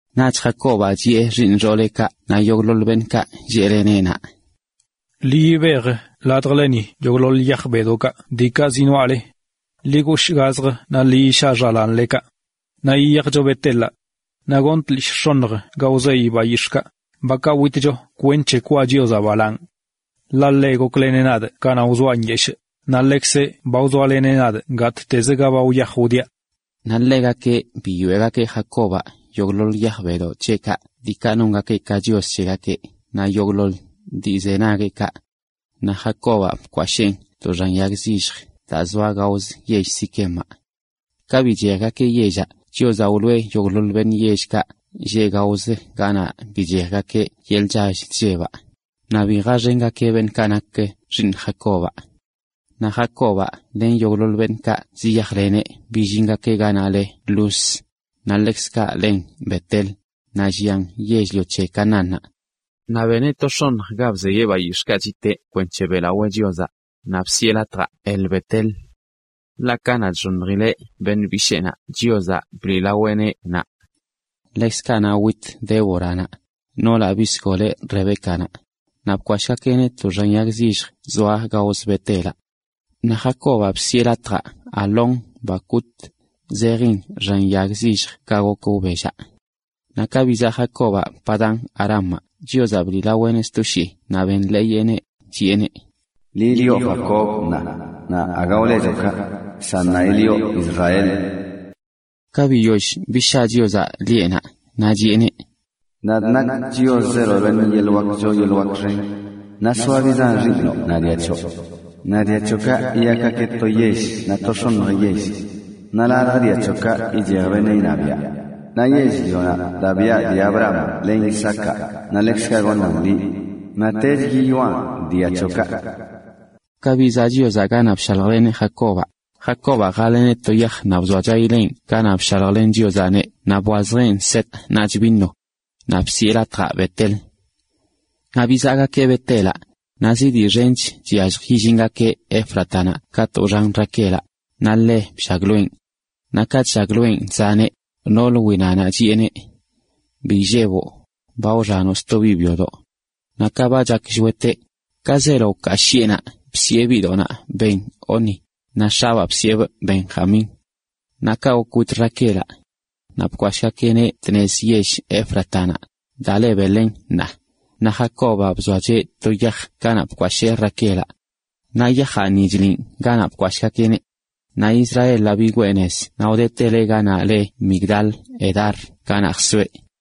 Naꞌch Jacobaꞌ chiꞌe xiiṉ xooleꞌkaꞌ naꞌ yogꞌḻoḻ beṉꞌkaꞌ lleꞌleneꞌ naꞌ: ―Ḻi yibej ladjleni yogꞌḻoḻ yaj bedoꞌkaꞌ diikaꞌ zinoaꞌle. Ḻi goshꞌ gazjə naꞌ ḻi yishaꞌ xalaanlekaꞌ. Ṉaa yiyajcho Bet-elaꞌ. Naꞌ gonꞌ tlishꞌ x̱oṉj ga wzeyꞌ bayix̱ꞌkaꞌ, bakaꞌ witcho kwenc̱he weꞌlawaa Chiozaꞌ. Ḻaꞌ ḻeꞌ gokleneꞌ nadꞌ kanaꞌ wzoaꞌ nyeshꞌ, naꞌ ḻeꞌkzeꞌ ba wzoaleneꞌ nadꞌ gattezə ga ba wyaj wdiaꞌ. Naꞌ ḻegakeꞌ biyoeꞌgakeꞌ Jacobaꞌ yogꞌḻoḻ yaj bedoꞌ c̱heꞌkaꞌ diikaꞌ nongakeꞌ ka chios c̱hegakeꞌ naꞌ yogꞌḻoḻ dii nze nagueꞌkaꞌ. Naꞌ Jacobaꞌ bkwasheen to xan yag zilljə daa zoa gaozə yell Siquemaꞌ. Ka bichejgakeꞌ yellaꞌ, Chiozaꞌ wloꞌe yogꞌḻoḻ beṉꞌ yellkaꞌ lleꞌ gaozə ganaꞌ bichejgakeꞌ yeḻꞌ chall chllebaꞌ, naꞌ bi jaxengakeꞌ beṉꞌkaꞌ nak xiiṉ Jacobaꞌ. Naꞌ Jacobaꞌ len yogꞌḻoḻ beṉꞌkaꞌ ziyajleneꞌ billingakeꞌ ganaꞌ le Luz, naꞌ ḻekzkaꞌ len Bet-el, naꞌ llian yell-lio c̱he Canaánnaꞌ. Naꞌ beneꞌ to x̱oṉj ga bzeyeꞌ bayix̱ꞌkaꞌ chiteꞌ kwenc̱he beꞌlawee Chiozaꞌ, naꞌ bsiꞌe latjaꞌ El-Bet-el. a Ḻaꞌ kanaꞌ chxoṉjileꞌ beṉꞌ bisheenaꞌ Chiozaꞌ bliꞌlaweꞌneꞌ naꞌ. Ḻekzkaꞌ naꞌ wit Déboranaꞌ, noolaꞌ bisgoleꞌ Rebécanaꞌ, naꞌ bkwashꞌgakeꞌneꞌ to xan yag zillj zoa gaozə Bet-elaꞌ. Naꞌ Jacobaꞌ bsiꞌe latjaꞌ Alón-bacut, naꞌ dillii zejin: xan yag zilljə ga gok wbellaꞌ. Naꞌ ka bizaꞌ Jacobaꞌ Padan-arámaꞌ Chiozaꞌ bliꞌlaweꞌneꞌ sto shii naꞌ benḻeeyeꞌneꞌ, chiꞌeneꞌ: “Liꞌ lioꞌ Jacob; naꞌ aga wlechoꞌ kaꞌ, san ṉaa yilioꞌ Israel.” Ka biyoll bishaa Chiozaꞌ lieꞌnaꞌ, naꞌ chiꞌeneꞌ: “Nadꞌ nakꞌ Chios, zeelo beṉꞌ yeḻꞌ wak choo yeḻꞌ wak xen, naꞌ soa biꞌ zan xiiṉo naꞌ dia c̱hoꞌ. Naꞌ dia c̱hoꞌkaꞌ yiyakgakeꞌ to yell naꞌ to x̱oṉj yell. Naꞌ ladj dia c̱hoꞌkaꞌ ichej beṉꞌ iṉabiaꞌ. Naꞌ yell-lionaꞌ daꞌ biꞌa dii Abrahamaꞌ len Isaacaꞌ naꞌ ḻekzkaꞌ goṉaꞌn liꞌ naꞌtech yiyoꞌan dia c̱hoꞌkaꞌ.” Ka bizaꞌ Chiozaꞌ ganaꞌ bshaljleneꞌ Jacobaꞌ, Jacobaꞌ jaḻeneꞌ to yaj naꞌ bzoachayileꞌn ganaꞌ bshaljlen Chiozaꞌneꞌ naꞌ bwazjeꞌn set naꞌch vino. Naꞌ bsiꞌe latjaꞌ Bet-el. Naꞌ bizaꞌgakeꞌ Bet-elaꞌ, naꞌ zi dii xench(zi latꞌ) chyallj illingakeꞌ Éfratanaꞌ katꞌ wxan Raquelaꞌ, naꞌ ḻe bllagloenꞌ. Naꞌ ka chllagloenꞌ chzaneꞌ, noolə winanaꞌ chiꞌeneꞌ: “Bi illeboꞌ, ba wxanoꞌ sto biꞌ byodoꞌ.” Naꞌ ka ba chak shweteꞌ, ka zeelo wkaa shiꞌenaꞌ bsiꞌe biꞌdoꞌnaꞌ Benoni, naꞌ x̱abaa bsiꞌebꞌ Benjamín. Naꞌ kaꞌ gok wit Raquelaꞌ. Naꞌ bkwashꞌgakeꞌneꞌ tnez yell Éfratanaꞌ, daa le Belén ṉaa. Naꞌ Jacobaꞌ bzoacheꞌ to yaj ganaꞌ bkwashee Raquelaꞌ. Naꞌ yajaꞌ ni chliꞌn ganaꞌ bkwasheeneꞌ. Naꞌ Israelaꞌ bigwee nez naꞌ wdeteleꞌ ganaꞌ le Migdal-edar ganaꞌ jsoeꞌ.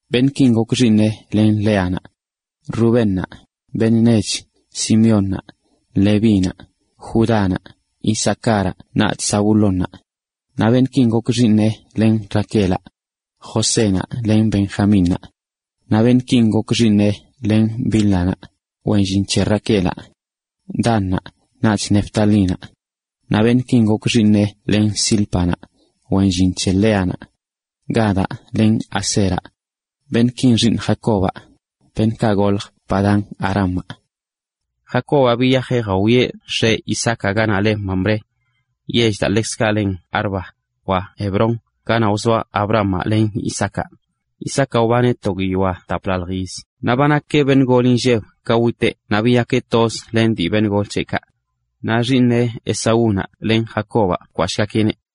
Beṉꞌkin gok xiiṉeꞌ len Léanaꞌ: Rubénaꞌ, beṉꞌ nech, Simeónnaꞌ, Levínaꞌ, Judánaꞌ, Isacáraꞌ naꞌch Zabulónaꞌ. Naꞌ beṉꞌkin gok xiiṉeꞌ len Raquelaꞌ: Josénaꞌ len Benjamínnaꞌ. Naꞌ beṉꞌkin gok xiiṉeꞌ len Bílhanaꞌ, wen llin c̱he Raquelaꞌ: Dannaꞌ, naꞌch Neftalínaꞌ. Naꞌ beṉꞌkin gok xiiṉeꞌ len Zílpanaꞌ, wen llin c̱he Léanaꞌ: Gadaꞌ len Aseraꞌ. Beṉꞌkin xiiṉ Jacobaꞌ, beṉꞌkaꞌ goljə Padán-arámaꞌ. Jacobaꞌ biyajeꞌ jawieꞌ x̱eꞌ, Isaacaꞌ, ganaꞌ le Mamré, yell daa ḻekzkaꞌ len Arba, wa Hebrón, ganaꞌ wzoaꞌ Abrahamaꞌ len Isaacaꞌ. Isaacaꞌ wbaneꞌ to guiyoa taplaḻj yiz naꞌ ba nakeꞌ beṉꞌ gol inlleb ka witeꞌ naꞌ biyakeꞌ toz len dii beṉꞌ gol c̱heꞌkaꞌ. Naꞌ xiiṉeꞌ Esaúnaꞌ len Jacobaꞌ bkwashꞌgakeꞌneꞌ.